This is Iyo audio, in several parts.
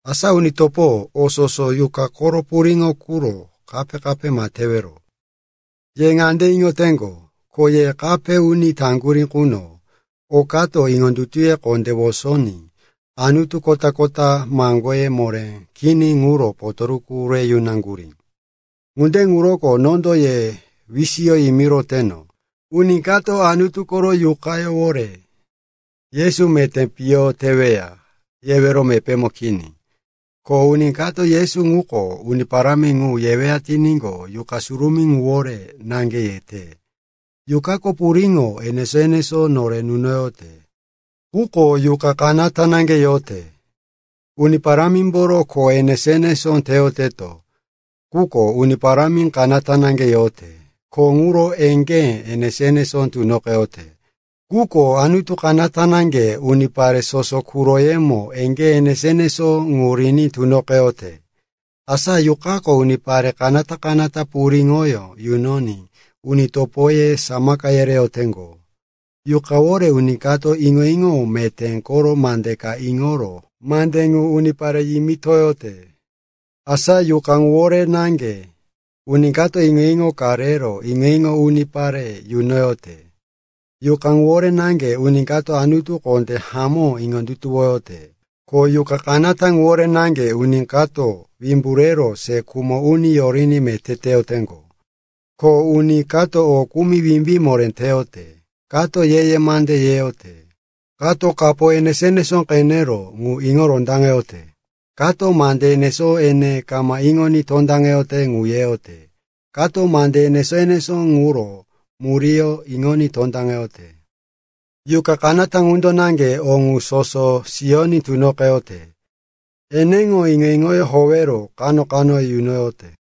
Asa uni topo, o soso yuqa koro puriŋo quro kape-kape ma tewero. Ye ŋande iŋoteŋgo, ko ye kape uni taŋgurí quno, okato iŋondutuye kondé wosoní anutu kota-kota maŋgoye moré kini ŋuro potoruku re yunaŋgurí. Ŋunde ŋuroko nondo ye wisiyo yimiroteno, uni kato Anutu koro Yuqawore, “Yesu meté piyo teweya,” yewero mepémo kini. Ko uni kato, “Yesu ŋuko Uni Parámi ŋu,” yeweya tiníqo, Yuqa Surumí ŋuwore naŋge yete. Yuqako puriŋo enesó-enesó nore nunoyote, quko Yuqa kanata naŋge yote. Uni Parámimboro kho enesó-enesó teyoteto, quko Uni Parámi kanata naŋge yote. Kho ŋuro eŋgé enesó-enesó tunoqeyote, quko Anutu kanata naŋge unipare soso quroyemo eŋgé enesó-enesó ŋu riní tunoqeyote. Asa Yuqako unipare kanata-kanata puriŋoyó yunoní uni topoye samaka yereyoteŋgo. Yuqawore uni kato iŋo-iŋo meté koro mande ka iŋoro mande ŋu unipare yimitoyote. Asa Yuqa ŋuwore naŋge uni kato iŋo-iŋo ka rero iŋo-iŋo ŋu unipare yunoyote. Yuqa ŋuwore naŋge uni kato Anutu kondé hamó iŋondutuwoyote. Ko Yuqa kanata ŋuwore naŋge uni kato wimbu rero se khumo uni yoriní meté teyoteŋgo. Ko uni kato o kumi wimbí moré teyote, kato ye-ye mande yeyote, kato kapo enesó-enesó qenero ŋu iŋo rondaŋeyote, kato mande enesó ene kama iŋoní tondaŋete ŋu yeyote, kato mande enesó-enesó ŋuro muríyó iŋoní tondaŋeyote. Yuqa kanata ŋundo naŋge o ŋu soso siyoní tunoqeyote. Eneŋo iŋo-iŋoyó howero kano-kano yunoyote.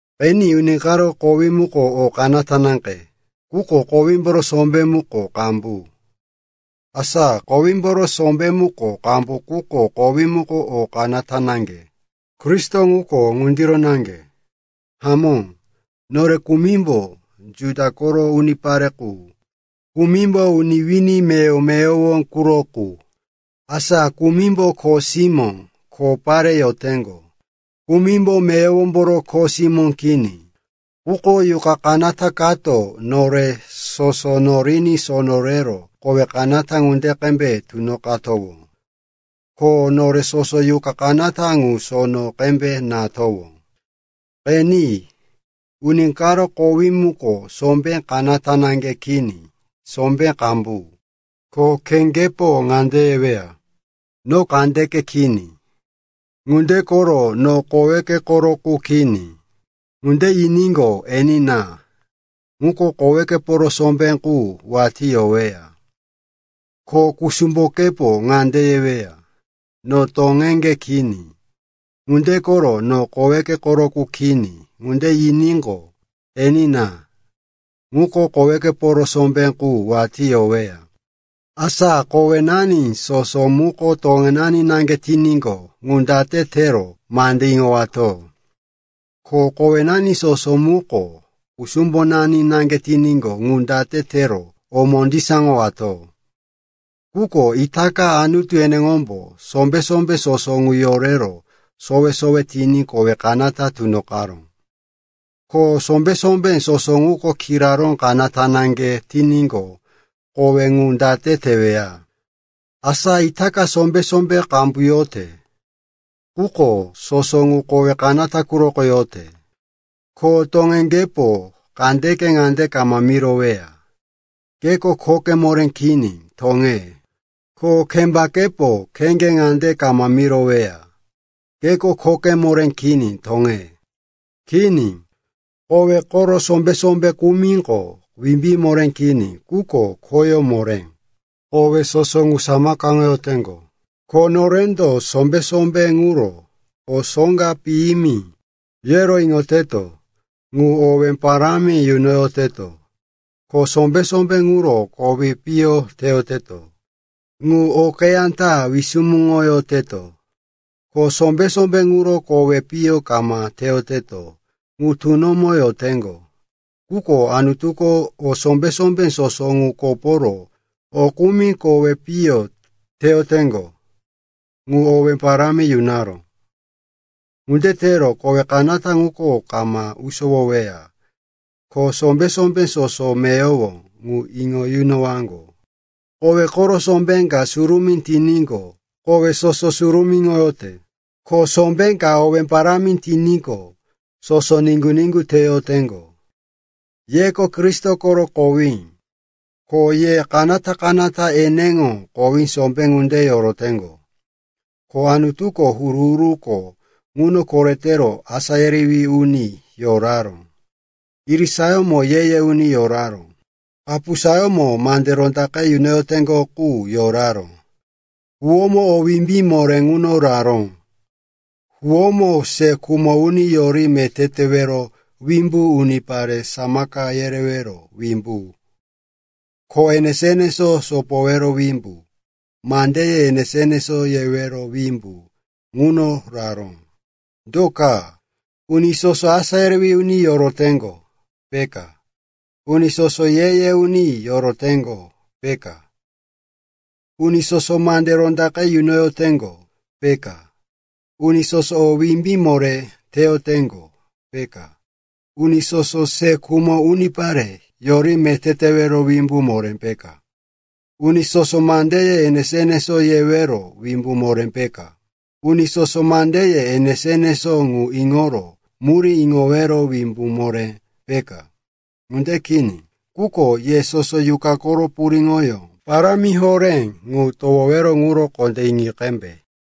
Qeni, uni karo kowí muko o kanata naŋge, quko kowímboro sombé muko qambu. Asa kowímboro sombé muko qambu quko kowí muko o kanata naŋge. Kristo ŋuko ŋundiro naŋge. Hamó, nore kumimbo Juda koro unipare qu, kumimbo uni wini meyowo-meyowo quro qu. Asa kumimbo kho simó, kho pare yoteŋgo, kumimbo meyowomboro kho simó kini. Quko Yuqa kanata kato nore soso noriní sono rero kowe kanata ŋunde qembe tunoqatowó. Ko nore soso Yuqa kanata ŋu sono qembe natowó. Qeni, uni karo kowí muko sombé kanata naŋge kini, sombé qambu. Ko kheŋgepo ŋande yeweya, “No kandeke kini. Ŋunde koro no koweke koro qu kini,” ŋunde yiníqo, enina, ŋuko kowekeporo sombé qu watí yoweya. Ko kusumbokepo ŋande yeweya, “No toŋeŋge kini. Ŋunde koro no koweke koro qu kini,” ŋunde yiníqo, enina, ŋuko kowekeporo sombé qu watí yoweya. Asa kowenani soso muko toŋenani naŋge tiníqo, ŋu date tero mande iŋowato? Ko kowenani soso muko kusumbonani naŋge tiníqo, ŋu date tero o mondisaŋoyowato? Quko itaka Anutu eneŋombo sombé-sombé soso ŋu yorero sowe-sowe tiní kowe kanata tunoqaró. Ko sombé-sombé soso ŋuko kiraró kanata naŋge tiníqo, kowe ŋu date teweya? Asa itaka sombé-sombé qambu yote, quko soso ŋu kowe kanata quroko yote. Ko toŋeŋgepo kandeke ŋande kama miroweya, “Keko khoke moré kini, toŋe.” Ko kembakepo kheŋge ŋande kama miroweya, “Keko khoke moré kini, toŋe.” Kini, kowe koro sombé-sombé kumiko wimbí moré kini, quko khoyó moré, kowe soso ŋu samakaŋoyoteŋgo. Ko norendo sombé-sombé ŋuro, o soŋga piyimi, yero iŋoyoteto, ŋu owé parámi yunoyoteto, ko sombé-sombé ŋuro kowi piyo teyoteto, ŋu okeyá ta wisumuŋoyoteto. Ko sombé-sombé ŋuro kowi piyo kama teyoteto ŋu tunomo yoteŋgo. Quko Anutuko o sombé-sombé soso ŋu koporo o kumi kowe piyo teyoteŋgo ŋu owé parámi yunaró. Ŋunde tero kowe kanata ŋuko kama usowoweya, ko sombé-sombé soso meyowo ŋu iŋo yunowaŋgo. Kowe koro sombé ka surumí tiníqo, kowe soso surumíŋoyote. Ko sombé ka owé parámi tiníqo, soso niŋgu-niŋgu teyoteŋgo. Yeko Kristo koro kowí, ko ye kanata-kanata eneŋo kowí sombé ŋunde yoroteŋgo. Ko Anutuko huru-huruko ŋuno koretero asá yerewí uni yoraró; irisayómo ye-ye uni yoraró; kapusayómo mande rondaqe yunoyoteŋgo qu yoraró. Huwómo o wimbí moré ŋuno raró, huwómo se khumo uni yori meté tewero wimbu, unipare samaka yereyowero wimbu, kho enesó-enesó sopoyowero wimbu, mandeye enesó-enesó yewero wimbu ŋuno raró. Do ka? Uni soso asá yerewí uni yoroteŋgo, peka? Uni soso ye-ye uni yoroteŋgo, peka? Uni soso mande rondaqe yunoyoteŋgo, peka? Uni soso o wimbí moré teyoteŋgo, peka? Uni soso se khumo unipare yori meté tewero wimbu moré peka? Uni soso mandeye enesó-enesó yewero wimbu moré peka? Uni soso mandeye enesó-enesó ŋu iŋoro murí iŋowero wimbu moré peka? Ŋunde kini. Quko ye soso Yuqa koro puriŋoyó parámi horé ŋu towowero ŋuro kondé iŋoyi qembe.